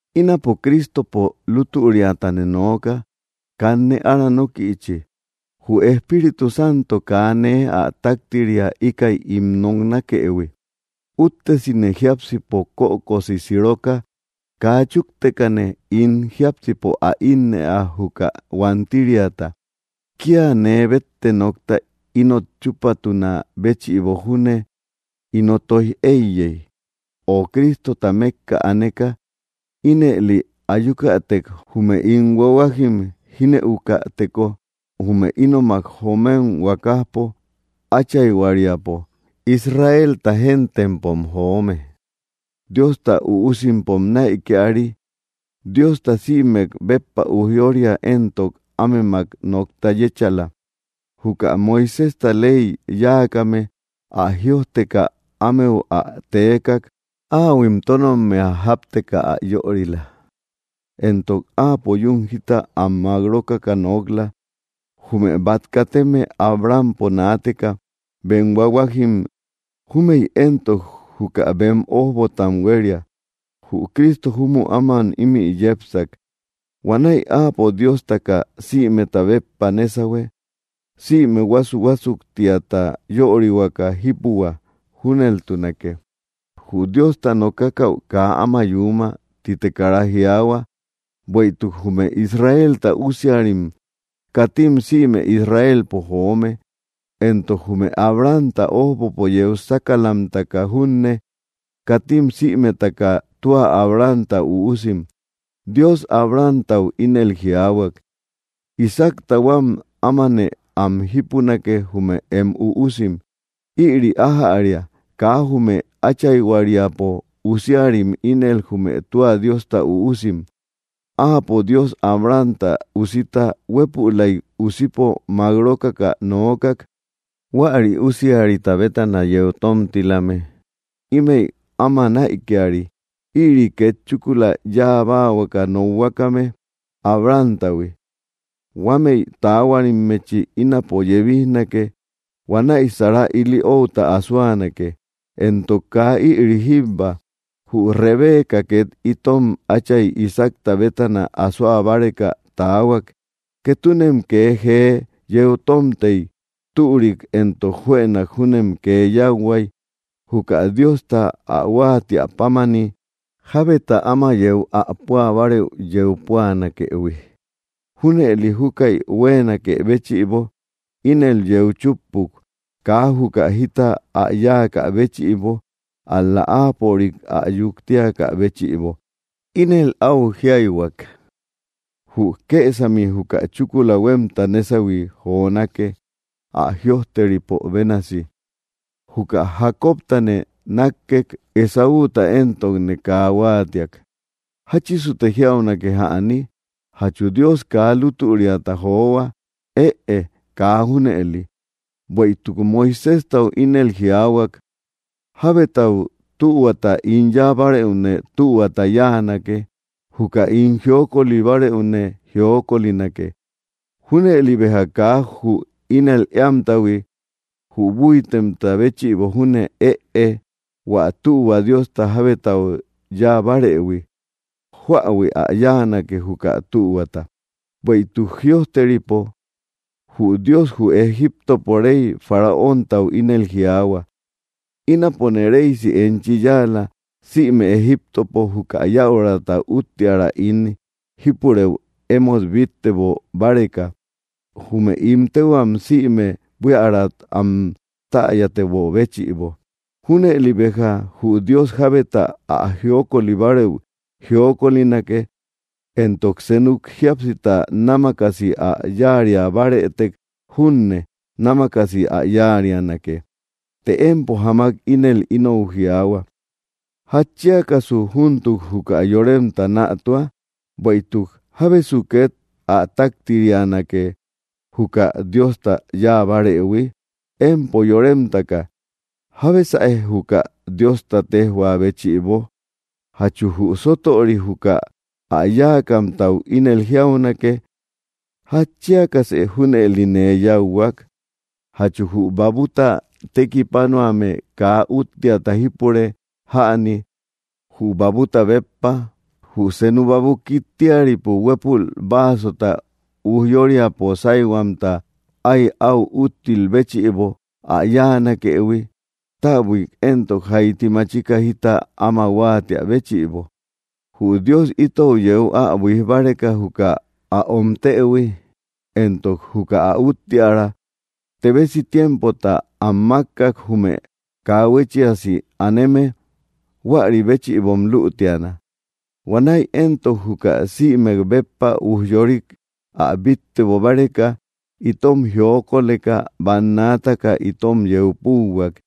Ínapo Cristopo lutüriatane nooka, kanne áranokïchi, jü Espíritu Santo, kaa nee ä taktiria íkäi ín ä noknakëhui, úttesine jiápsipo kökosi siroka kaa chuktekane ín jiápsipo ä innëa juka huantiriata. Kia nee bette nokta inot chupatuna béchïbo júne ino toij eiyey, ö Cristotau mekka aneka, ínëli ayükatek jume ín huahuajim jinëukäteko, jume ínomak joomem huakajpo, áchayhuariapo. Israelta géntempom joome; Diosta üusimpom näikiari; Diosta sïmek béppa ujyória; entok ámemak nokta yéchala, juka Moiséjta ley yáakame; ä jïojteka ámeau ä teekak, áahuim tónnommea jápteka ä yörila, entok Áapo yún jita am mák rókaka nok‑la. Jume bat kateme Abrahampo naateka bem huahuajim; júmëi éntok, juka bem ójbotam huéria. Jü Cristo júmü áman ímï yepsak. Huanäi Áapo Diostaka sïmeta béppa nésahue, sïme huásu‑huásuktiata yörihuaka jípuhua. Júneltunake. “Jü Diosta nokakäu kaa áma yuuma”, tite kara jiaahua; bueïtuk jume Israelta usiarim, katim sïme Israelpo joome. Entok jume Abrahamta ójbopo yeu sákalamtaka junne, katim sïmetaka tua Abrahamta üusim. Dios Abrahamtau ínel jiaahuak: “Isaacta huam ámanë am jípunake, jume em üusim.” Ïri ájäria, kaa jume áchayhuariapo usiarim ínel jume tua Diosta üusim; áapo Dios Abrahamta usita huépülaik usipo mák rókaka nookak. Huäri usiarita bétana yeu tómtilame, ímëi áma näikiari. Ïri ínel chúkula yáa báahuaka nokhuakame, Abrahamtahui: “Huámëi taahuarimmechi ínapo yebijnake; huanäi Sara ili outa asoanake.” Entok kaa ïri jíbba; jü Rebeca két itom átchay Isaacta bétana asoa báreka taahuak. Ketunem kee jee yeu tómtey, türik entok juënak júnem kee yáuhuay, juka Diosta ä huáatiä pámani, jábeta áma yeu ä púa bárëu yeu ä púanakëhui. Júnëli júkäi huéenakë béchïbo, ínel yeu chúppuk, kaa juka jita ä yáakä béchïbo, ál‑la áapörik ä yuktiakä béchïbo. Ínel áu jíayhuak: “Jü kësami juka chúkula huémta nésahui jonake.” Ä jïojteripo bénasi: “Juka Jacobtane nákkek Esáuta entok kaa huaatiak.” ¿Jáchisute jiaunake jäni? ¿Jachu Dios kaa lútüriata johua? ¡Ëe! Kaa junëli. Bueïtuk Moiséjtau ínel jiaahuak: “Jábetau tühuata ín yáa bárëune tühuata yáanake; juka ín jiokoli bárëune jiokolinake.” Júnëli béja kaa jü ínel éamtahui, jü búitemta béchïbo júne ëe, hua tühua Diosta jábetau yáa barëhui, jóähui ä yáanake, juka tühuata. Bueïtuk jïojteripo: “Jü Dios jü Egiptopo rey Faraóntau ínel jiaahua: Ínapone reysi enchi yáala sïme Egiptopo, juka yäura uttiära ín jipureü emót bíttebo báreka, jume ín téhuam sïme buíärat am täyatebö béchïbo.” Júnëli béja jü Dios jábeta ä jiokoli bárëu jiokolinake, entok senuk jíapsita námakasi ä yáaria bárëtek junne, námakasi ä yáarianake. Të empo jámak ínel inou jiaahua: “¿Jatchiakasu júntuk juka yoremta nätua? Bueïtuk, ¿jábesu két ä táktirianake, juka Diosta yáa bárëhui?” Empo yóremtaka, ¿jábesäe, juka Diosta téjhua béchïbo? ¿Jachu jü sótöri juka ä yáakamtau ínel jiaunake? “¿Jatchiakasë júneli nee yáuhuak?” Jachu jü babuta tekipanuame kaa úttiata jipure jäni, jü babuta béppa. Jü senu baabu kittiaripo huepul basota újyoriapo sayhuamta ay au úttil béchïibo ä yáanakëhui, täbuik entok jayti machika jita ama huattia béchïbo. Jü Dios itou yeu ä buíj báreka juka ä omtëhui entok juka ä úttiära, tebesi tiempota am mákkak, jume kaa huéchiasi aneme. Huäri béchïbom lütiana. Huanäi éntok juka sïmek béppa ujyorik ä bíttebo báreka, itom jiokoleka bannaataka itom yeu púuhuak,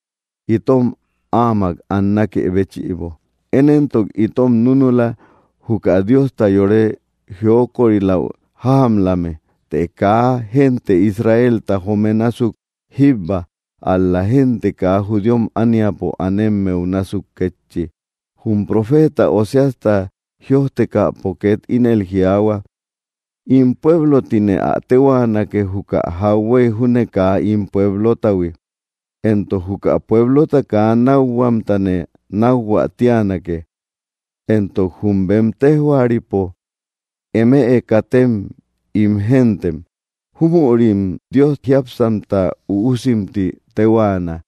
itom áamak annakë béchïbo. Én éntok itom núnula, juka Diosta yore jiokoriläu jájamlame, të kaa gente Israelta joome násuk jíbba, ál‑la génte kaa judíom ániapo anemmeu násuk kétchi. Jum profeeta Oseasta jïojtekäpo két ínel jiaahua: In pueblo tine ä téhuaanake, juka jauhuey júne kaa ín pueblotahui, entok juka pueblota kaa nákhuamtane nákhuä tíanake. Entok jum bem tejhuaripo: “Emëe katem ín gentem”, júmürim Dios jiápsamta üusim ti tehuaana.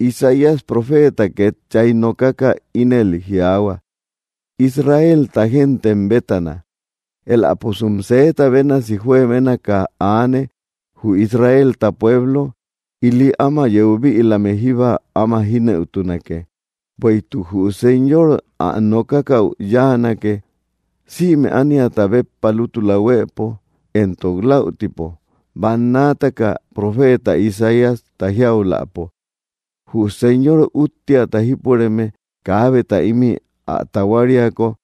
Isaías profeeta két chay nókaka ínel jiaahua: “Israelta gente bétana. Eläposum sëeta bénasi juebénaka aane, jü Israelta pueblo, ili ama yeu bïlame jíba áma jínëutunake. Bueïtuk jü Señor ä nokakäu yáanake, sïme ániata béppa, lútula huëpo, entok läutipo.” Bannaataka profeeta Isaíasta jiauläpo: Jü Señor úttiata jípureme kaabeta ímï ä tahuariako, pueblo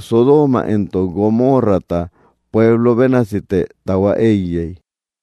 Sodooma entok Gomorrata pueblota bénasite tahua éiyey.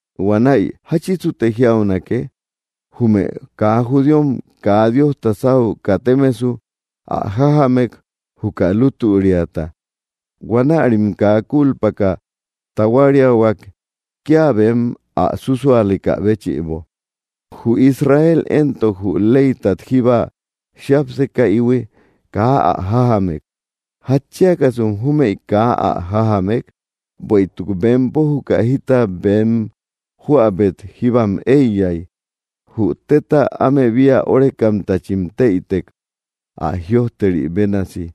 Huanäi, ¿jáchisute jiaunake? Jume kaa judíom kaa Diosta sáu katemesu ä jájamek juka lútüriata. Huanärim kaa culpaka tahuariahuak, kia bem ä súsualekä béchïbo. Jü Israel éntok jü leytat jíba jiápsekaïhui, kaa ä jájamek. ¿Jatchiakasum jumeï kaa ä jájamek? Bueïtuk bempo juka jita bem jóäbet jíbam éiyay. Jü téta áme bia órekamtachim téïtek. Ä jïojteri bénasi: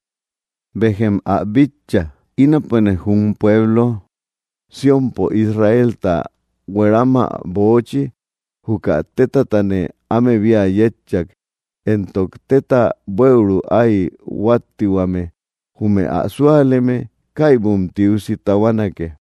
Béjem ä bitcha, ínapone jum pueblo Siónpo Israelta hueramä böochi, juka tétatane áme bia yétcha; entok téta bueru ay huattihuame; jume ä súaleme; kaybum tiusi tahuanake.